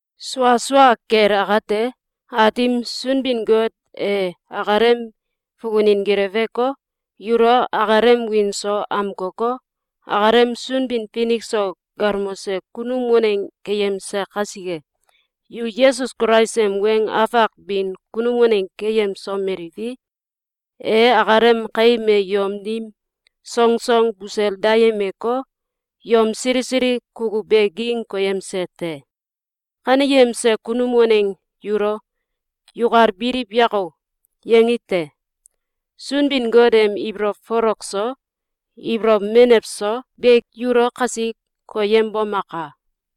Sua sua kel akate, Aatim Sunbin-Got e akalem fukunin geleweko, yulo akalem wiin so amkoko, akalem Sunbin-Finik so galmose kunum waneng keyemse kasike, yu Yesus Kulais em weng afak bin kunum waneng keyemsomeliwi, e akalem kaim e yom dim songsong busel dayemeko, yom sili sili kukuw be ging koyemse te. Kaneyemse kunum waneng yulo “Yukal biliw yako!”, yangi te. Sunbin-Got em ibolow folok so, ibolow menew so be yulo kasi koyembomaka!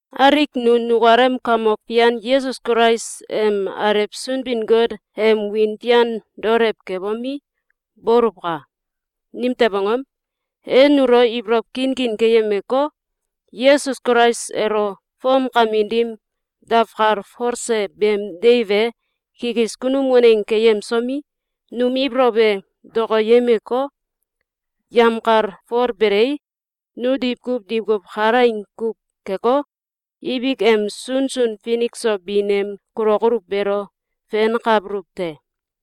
Alik nu nukalem Kamok Fian Yesus Kulais em Alew Sunbin-Got em wiin fian daolew kebomi, boluwka! Nimtew angom? E nulo ibolow kinkin keyemeko, Yesus Kulais elo fomkamin dim dawkalfolse beem deiw e kikis kunum waneng keyemsomi, num ibolow e dokoyemeko, yemkalfolbelei, nu diwkuw diwkuw kalaing kuw keko, ibik em sunsun finik so bin em kulokoluw beelo fenkabuluw te.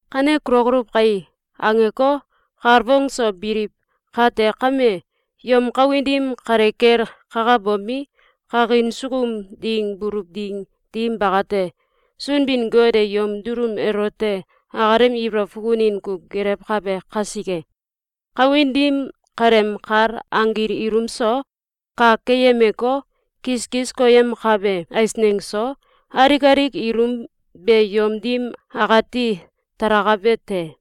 “Kane kulokoluw kai!”, angeko, kalfong so biliw kate kame, yom kawin dim kale kel kakabomi, kakin sukum ding buluw ding dim bakate, Sunbin-Got e yom dulum elote akalem ibolow fukunin kuw gelewkabe kasike, kawin dim kaleem kal anggil ilum so, kak keyemeko, kiskis koyemkabe eisneng so, alik alik ilum be yom dim akati talakabe te.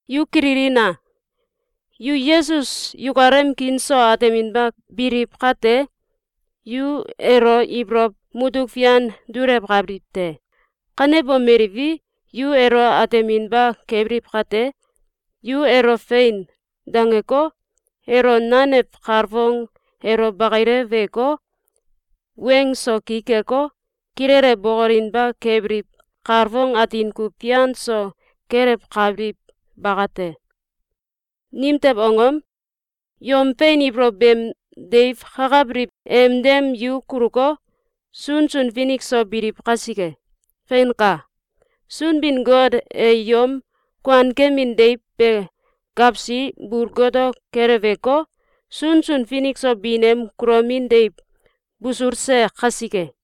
Yu kililina! Yu Yesus yukalem kiin so ateminba biliw kate, yu elo ibolow mutuk fian dulewkabiliw te. Kanebomeliwi, yu elo ateminba kebiliw kate, yu elo “Fein!”, dangeko, elo nanew kalfong elo bakileweko, weng so ki keko, kilele bokolinba kebiliw kalfong atin kuw fian so kelewkabiliw bakate. Nimtew angom? Yom fein ibolow beem deiw kakabiliw em dem yu kuluko, sunsun finik so biliw kasike. Feinka! Sunbin-Got e yom kuankemin deiw be gawsi bul goto keleweko, sunsun finik so bin em kulomin deiw busulse kasike.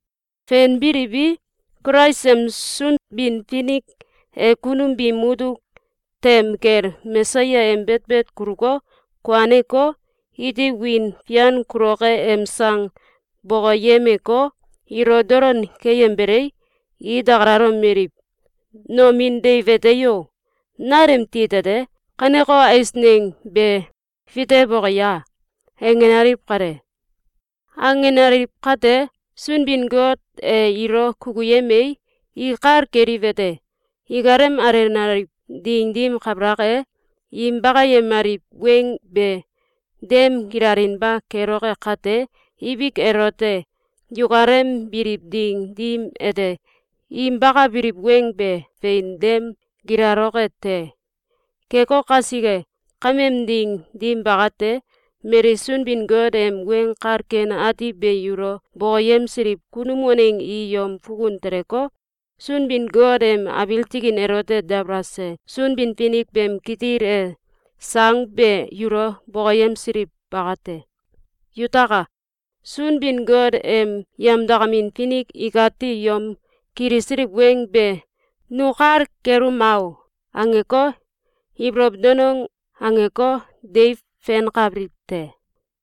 Fenbiliwi, Kulais em Sunbin-Finik e kunum biim mutuk tem kel Mesaya em betbet kuluko, kuaneko, iti wiin fian kuloke em sang bokoyemeko, ilo dolon keyembelei, i dakalalomeliw: “Nomin deiw ete o? Nal em tit ete, kaneko eisneng be fitewoke ya?”, angenaliw kale. Angenaliw kate, Sunbin-Got e ilo kukuyemei, i kal keliwete: Ikalem alenaliw ding dim kabalak e, im bakayemaliw weng be dem gilalinba keloke kate, ibik elote, yukalem biliw ding dim ete, im bakabiliw weng be fein dem gilaloke te. Keko kasike, kameem ding dim bakate, mali Sunbin-Got em Weng Kal Ken Ati be yulo bokoyemsiliw kunum waneng i yom fukun teleko, Sunbin-Got em abiil tikin elote dabalase Sunbin-Finik beem kitil e sang be yulo bokoyemsiliw bakate. Yutaka! Sunbin-Got em yemdakamin finik ikati yom kilisiliw weng be “Nu kal keluma o!”, angeko, ibolow danong angeko, deiw fenkabiliw te.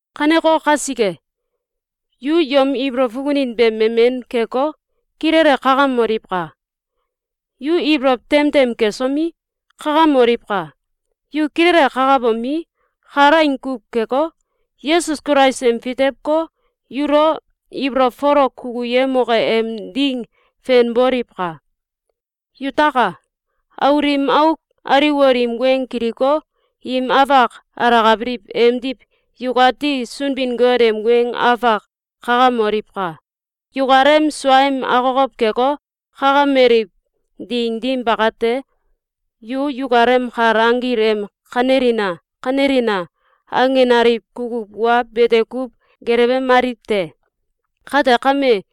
Kaneko kasike, yu yom ibolow fukunin be memen keko, kilele kakamoliwka! Yu ibolow tem tem kesomi, kakamoliwka! Yu kilele kakabomi, kalaing kuw keko, Yesus Kulais em fitewko, yulo ibolow folok kukuyemoke em ding fenboliwka! Yutaka! Aul im auk aliwol im weng kiliko, im afak alakabiliw emdiw yukati Sunbin-Got em weng afak kakamoliwka! Yukalem suaem akokow keko, kakameliw ding dim bakate, yu yukalem kal anggil em “Kanelina! Kanelina!”, angenaliw kukuw wa bete kuw gelewemaliw te. Kate kame,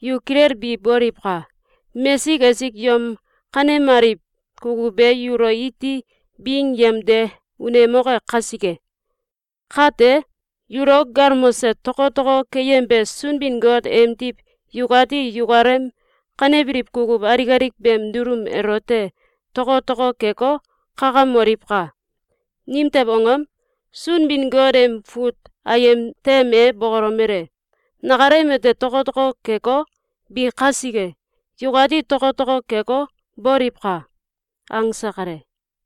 yu kilelbi boliwka! Mesik esik yom kanemaliw kukuw be yulo iti bing yemde unemoke kasike! Kate, yulo galmose tokotoko keyembe Sunbin-Got emdiw yukati yukalem kanebiliw kukuw alik alik beem dulum elote tokotoko keko, kakamoliwka! Nimtew angom? Sunbin-Got em fut ayem tem e bokolomele: “Nakalem ete tokotoko keko, bi kasike, yukati tokotoko keko, boliwka!”, angse kale.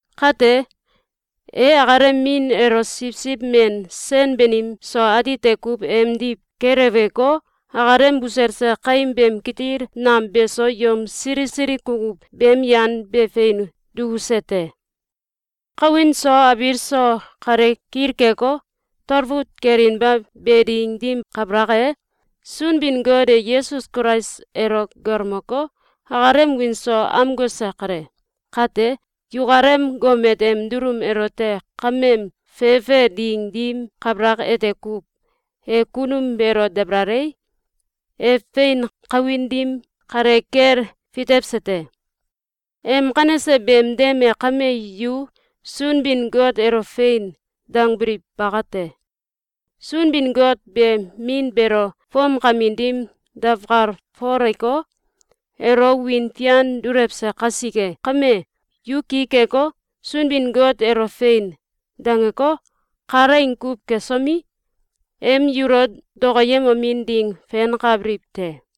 Kate, e akalem min elo siwsiw men sen banim so atite kuw emdiw keleweko, akalem buselse kaim beem kitil nam beso yom sili sili kukuw beem yan be fein dukuse te. Kawin so abiil so kale kilkeko, talfut kelinba be ding dim kabalak e, Sunbin-Got e Yesus Kulais elo galmoko, akalem wiin so amkose kale. Kate, yukalem gomet em dulum elote kameem fefe ding dim kabalak ete kuw, e kunum beelo dabalalei, e fein kawin dim kale kel fitewse te. Em kanese beem dem e kame yu Sunbin-Got elo “Fein!”, dangbiliw bakate. Sunbin-Got be Min beelo fomkamin dim dawkalfoleko, elo wiin fian dulewse kasike kame, yu ki keko, Sunbin-Got elo “Fein!”, dangeko, kalaing kuw kesomi, em yulo dokoyemomin ding fenkabiliw te.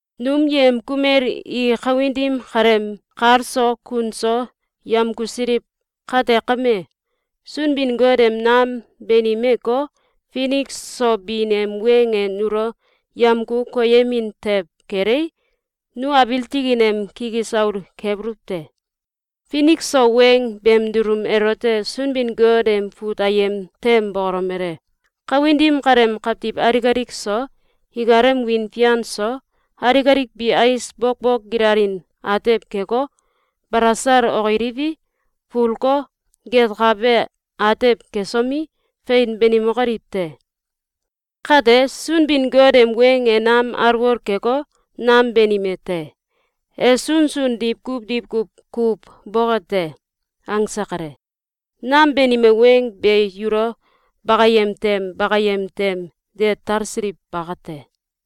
Num yem kumel i kawin dim kaleem kal so kun so yemkusiliw kate kame, Sunbin-Got em nam banimeko, finik so bin em weng e nulo yemku koyemin tew kelei, nu abiil tikin em kikis aul kebuluw te. Finik so weng beem dulum elote Sunbin-Got em fut ayem tem bokolomele: “Kawin dim kaleem kawtiw alik alik so, ikalem wiin fian so, alik alik bi ais bokbok gilalin atew keko, balasal okiliwi, fulko, getkabe atew kesomi, fein banimokoliw te. Kate, Sunbin-Got em weng e nam alwol keko, nam banime te. E sunsun diwkuw diwkuw kuw boke te.”, angse kale. Nam banime weng be yulo bakayem tem bakayem tem de talsiliw bakate.